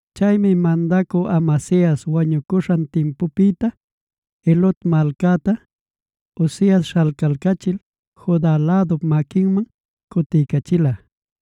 Chaymi mandacü Amasias wañucuśhan timpupïta, Elot malcacta Uzias śhalcalcachil Juda lädup maquinman cutiycachila.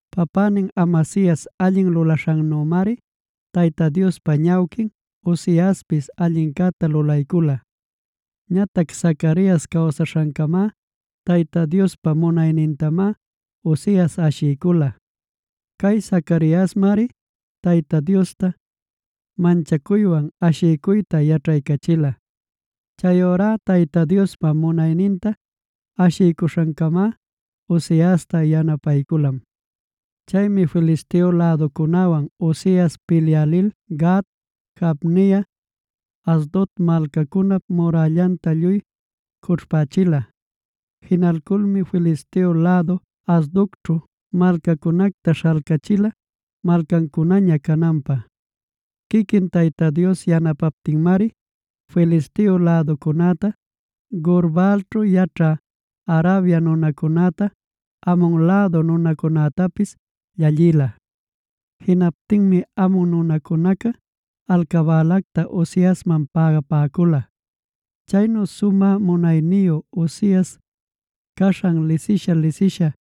Papänin Amasias allin lulaśhannümari Tayta Diospa ñawquin Uziaspis allincäta lulaycula. Ñatac Zacarias cawsaśhancamá Tayta Diospa munaynintamá Uzias ashiycula. Cay Zacariasmari Tayta Diosta manchacuywan ashiycuyta yaćhaycachila. Chayurá Tayta Diospa munayninta ashiycuśhancamá Uziasta yanapayculam. Chaymi Filisteo läducunäwan Uzias pilyä lil Gat, Jabnia, Asdod malcacunap murällanta lluy cućhpächila. Jinalculmi Filisteo lädu Asdodćhu malcacunacta śhalcachila malcancunaña cananpä. Quiquin Tayta Dios yanapaptinmari Filisteo läducunäta, Gur-baalćhu yaćhä Arabia nunacunäta, Amon lädu nunacunätapis llallïla. Jinaptinmi Amon nunacunaca alcabälacta Uziasman pägapäcula. Chaynu sumä munayniyu Uzias caśhan lisisha-lisisha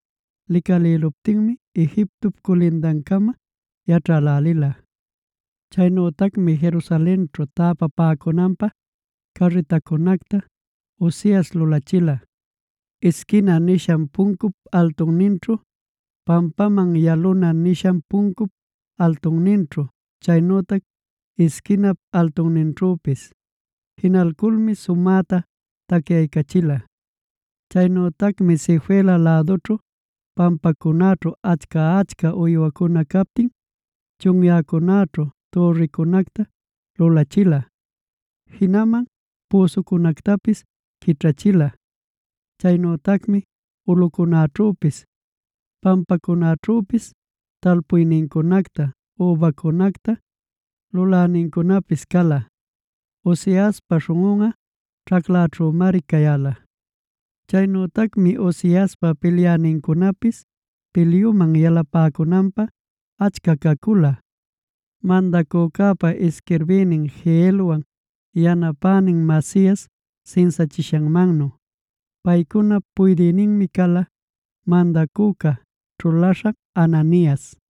licalïluptinmi Egiptop culindancama yaćhälälila. Chaynütacmi Jerusalenćhu täpapäcunanpä türricunacta Uzias lulachila: Isquina nishan puncup altunninćhu, pampaman yaluna nishan puncup altunninćhu, chaynütac isquinap altunninćhüpis. Jinalculmi sumäta tacyaycachila. Chaynütacmi Sefela lädućhu, pampacunäćhu achca-achca uywancuna captin, chunyäcunäćhu türricunacta lulachila, jinaman püsucunactapis quićhachila. Chaynütacmi ulꞌucunäćhüpis pampacunäćhüpis talpuynincunacta übancunacta lulänincunapis cala. Uziaspa śhunꞌunꞌa ćhaclaćhümari cayäla. Chaynütacmi Uziaspa pilyänincunapis pilyuman yalapäcunanpä achca cacula, mandacücäpa isquirbïnin Jeielwan yanapänin Maasias sinsachishanmannu. Paycunap puydïninmi cala mandacüca ćhulaśhan Hananias.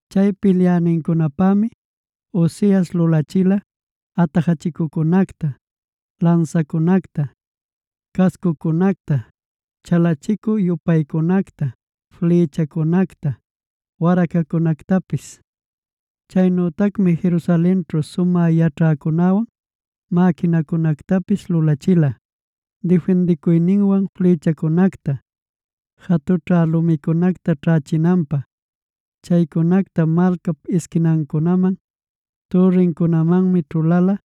Chay pilyänincunapämi Uzias lulachila: atajachicuncunacta, lansacunacta, cascucunacta, chalicu-yupaycunacta, flïchacunacta, waracacunactapis. Chaynütacmi Jerusalenćhu sumä yaćhäcunäwan mäquinacunactapis lulachila, difindicuyninwan flïchacunacta, jatućha lumicunacta ćhächinanpä. Chaycunacta malcap isquinancunaman, türricunämanmi ćhuläla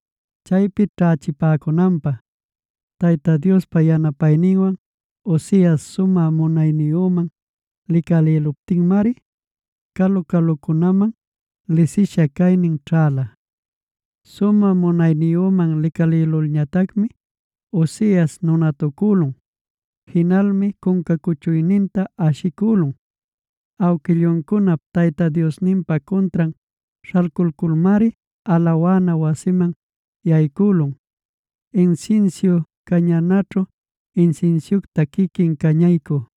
chaypi ćhächipäcunanpä. Tayta Diospa yanapayninwan Uzias sumä munayniyüman licalïluptinmari calu-calucunaman lisisha caynin ćhäla. Sumä munayniyüman licalïlulñatacmi Uzias nunatucülun. Jinalmi cunca cuchuyninta ashicülun. Awquilluncunap Tayta Diosninpa cuntran śhalculculmari alawana wasiman yaycülun, insinsiu cañanaćhu insinsiucta quiquin cañaycü.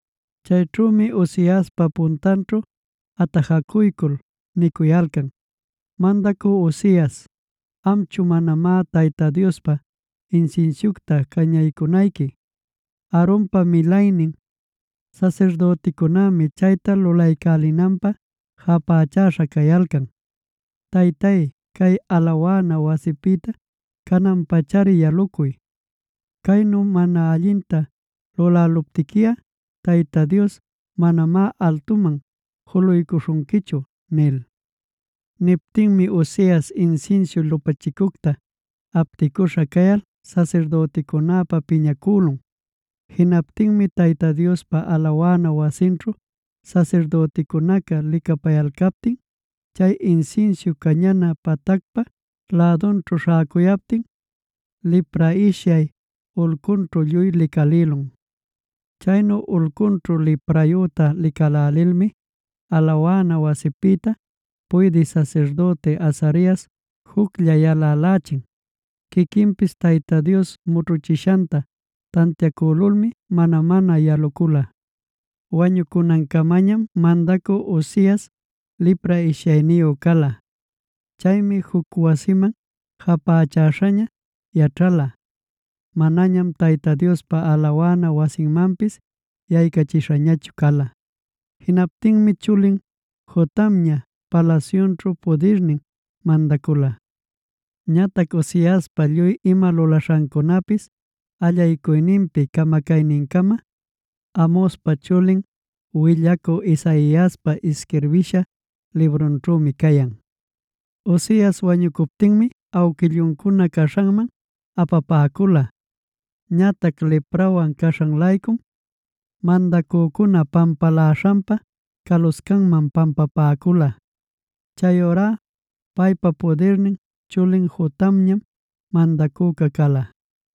Chayćhümi Uziaspa puntanćhu atajacuycul nicuyalcan: “Mandacü Uzias, amchu manamá Tayta Diospa insinsiucta cañaycunayqui. Aaronpa milaynin sasirdüticunämi chayta lulaycälinanpä japächäśha cayalcan.b Taytay, cay alawana wasipïta canan-pachari yalucuy. Caynu mana allinta lulayaptiquiꞌa, Tayta Dios manamá altuman juluycuśhunquichu” nil. Niptinmi Uzias insinsiu lupachicunacta apticüśhaña cayal sasirdüticunäpa piñacülun. Jinaptinmi Tayta Diospa alawana wasinćhu sasirdüticunaca licapayalcaptin, chay insinsiu cañana patacpa lädunćhu śhäcuyaptin, lipra ishyay ulcunćhu lluy licalïlun. Chaynu ulcunćhu liprayüta licälälilmi alawana wasipïta puydï sasirdüti Azarias juclla yalälächin. Quiquinpis Tayta Dios mućhuchishanta tantiacülulmi mana-mana yalucula. Wañucunancamañam mandacü Uzias lipra ishyayniyu cala. Chaymi juc wasiman japächäśhaña yaćhala; manañam Tayta Diospa alawana wasinmanpis yaycachishañachu cala. Jinaptinmi chulin Jotamña palasyućhu pudirnin mandacula. Ñatac Uziaspa lluy ima lulaśhancunapis allaycuyninpi camacaynincama, Amozpa chulin willacü Isaiaspa isquirbisha librunćhümi cayan. Uzias wañucuptinmic awquilluncuna caśhanman apapäcula. Ñatac liprawan caśhan-laycum mandacücuna pampaläśhanpa caluscanman pampapäcula. Chayurá paypa pudirnin chulin Jotamñam mandacüca cala.